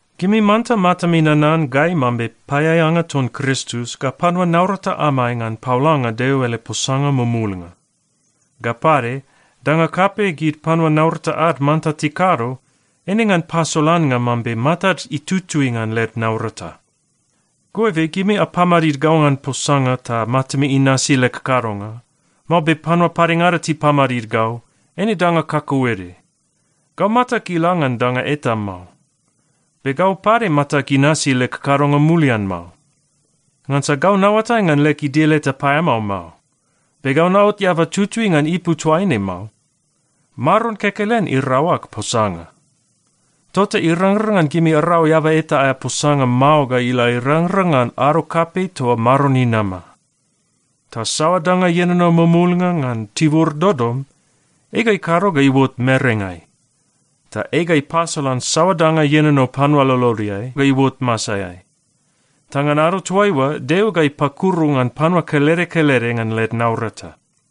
Gimi manta matami nanan gai mambe paeaeanga ton Kristus ga panua naurata amai ngan paolanga Deo ele posanga mumulnga. Ga pade, danga kapei gid panua naurata ad manta tikado, eine ngan pasolannga mambe matad itutui ngan led naurata. Goibe gimi apamadid gau ngan posanga ta matami inasi leg kadonga, mao be panua padengada tipamadid gau, eine danga kakauede. Gau matag ila ngan danga eta mao. Be gau pade matag inasi leg kadonga mulian mao. Ngansa gau naoatai ngan leg idil eta paeamao mao. Be gau naot eaba tutui ngan ipu toaine mao. Maron kekelen irau ag posanga. Tota irangrang ngan gimi arau eaba eta aea posanga mao ga ila irangrang ngan ado kapei toa Maron inama. Ta saoa danga ienono mumulnga ngan tibur dodom, ei ga ikado ga iuot merengai. Ta ei ga ipasolan saoa danga ienono panua lolodeai ga iuot masaeai. Ta ngan ado toaiua, Deo ga ipakuru ngan panua kelede kelede ngan led naurata.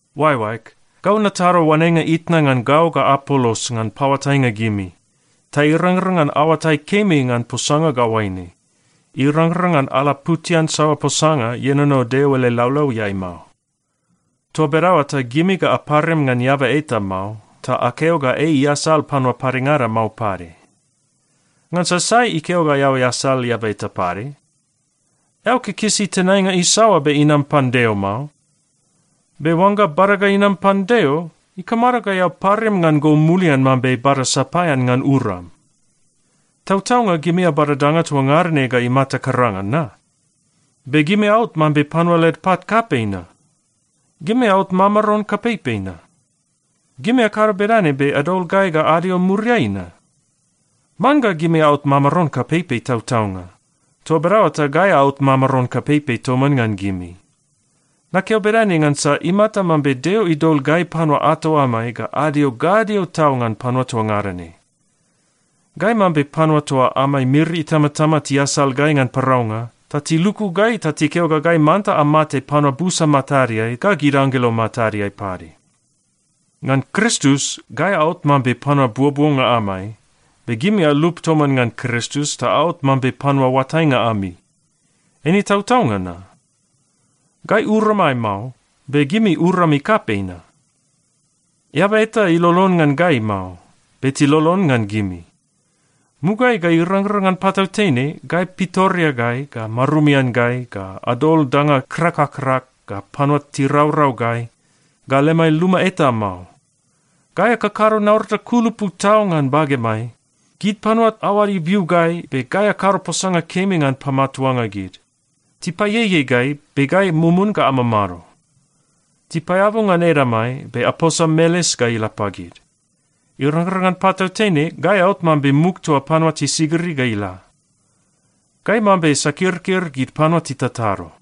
Oaeoaeg, gau natado oanenga itna ngan gau ga Apolos ngan paoatainga gimi, ta irangrang ngan aoatai kemi ngan posanga ga oaine, “Irangrang ngan alaputian saoa posanga ienono Deo ele laulauiai mao.” Toa bedaoa ta gimi ga aparim ngan eaba eta mao, ta akeo ga ei iasal panua padengada mao pade. Ngansa sai ikeo ga eao easal eaba eta pade? Eao kikisi tenainga isaoa be inam pan Deo mao? Be oangga bada ga inam pan Deo, ikamado ga eao parim ngan go mulian mambe bada sapaean ngan uram? Tautaunga gimi abada danga toa ngada ne ga imata karanga na? Be gimi aot mambe panua led pat kapei na? Gimi aot mamaron kapeipei na? Gimi akado bedane be adol gai ga adio muriai na? Man ga gimi aot mamaron kapeipei tautaunga. Toa bedaoa ta gai aot mamaron kapeipei toman ngan gimi! Nakeo bedane ngansa imata mambe Deo idol gai panua ato amai ga adio gadio tau ngan panua toa ngada ne. Gai mambe panua toa amai miri itamatama tiasal gai ngan paraunga, ta tiluku gai ta tikeo ga gai manta amate panua busa matadeai ga gid anggelo matadeai pade. Ngan Kristus, gai aot mambe panua buobuonga amai, be gimi alup toman ngan Kristus ta aot mambe panua oatainga ami. Eine tautaunga na? Gai uramai mao, be gimi urami kapei na? Eaba eta ilolon ngan gai mao, be tilolon ngan gimi. Mugaeai ga irangrang ngan patautene gai pitoreagai, ga marumian gai, ga adol danga krak ga krak, ga panua tiraurau gai, ga lemai luma eta mao. Gai akakado naurata kulupu tau ngan bagemai. Gid panua aoad ibiu gai, be gai akado posanga kemi ngan pamatuanga gid. Tipaieiei gai, be gai mumun ga amamado. Tipaeabu ngan edamai, be aposa meles ga ila pagid. Irangrang ngan patautene, gai aot mambe muk toa gid panua tisigiri ga ila. Gai mambe sakirkir gid panua titatado.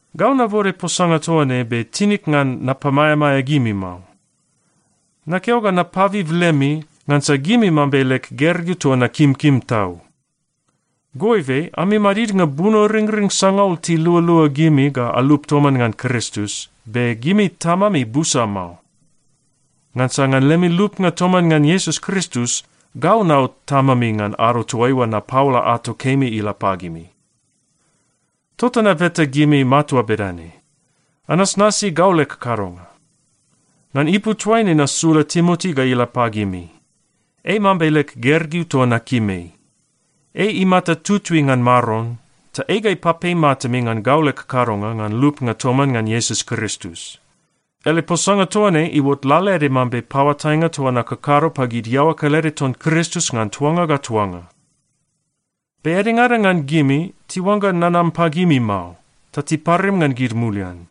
Gau nabode posanga toa ne be tinig ngan napamaeamaea gimi mao. Nakeo ga napabib lemi, ngansa gimi mambe leg gergeu toa nakimkim tau. Goibe, ami madidnga bunoringring sangaul tilualua gimi ga alup toman ngan Kristus, be gimi tamami busa mao. Ngansa ngan lemi lupnga toman ngan Iesus Kristus, gau naot tamami ngan ado toaiua napaola ato kemi ila pagimi. Tota nabeta gimi matua bedane: Anasnasi gau leg kadonga. Ngan ipu toaine nasula Timoti ga ila pagimi. Ei mambe leg gergeu toa nakim ei. Ei imata tutui ngan Maron, ta ei ga ipapei matami ngan gau leg kadonga ngan lupnga toman ngan Iesus Kristus. Ele posanga toa ne iuot lalaede mambe paoatainga toa nakakado pagid iaoa kelede ton Kristus ngan tuanga ga tuanga. Be edengada ngan gimi tiuangga nanam pagimi mao, ta tiparim ngan gid mulian.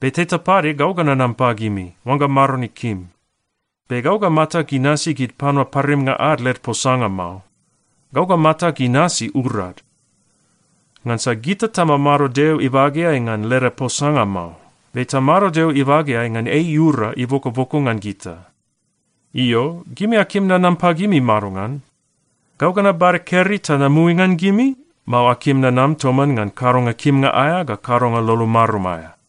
Be teta pade gau ga nanam pagimi, oangga Maron ikim, be gau ga matag inasi gid panua parimnga ad led posanga mao. Gau ga matag inasi urad. Ngansa gita tamamado Deo ibageai ngan leda posanga mao, be tamado Deo ibageai ngan ei iura ibokoboko ngan gita. Io, gimi akim nanam pagimi madongan? Gau ga nabada keri ta namui ngan gimi, mao akim nanam toman ngan kadonga kimnga aea ga kadonga lolo marum aea?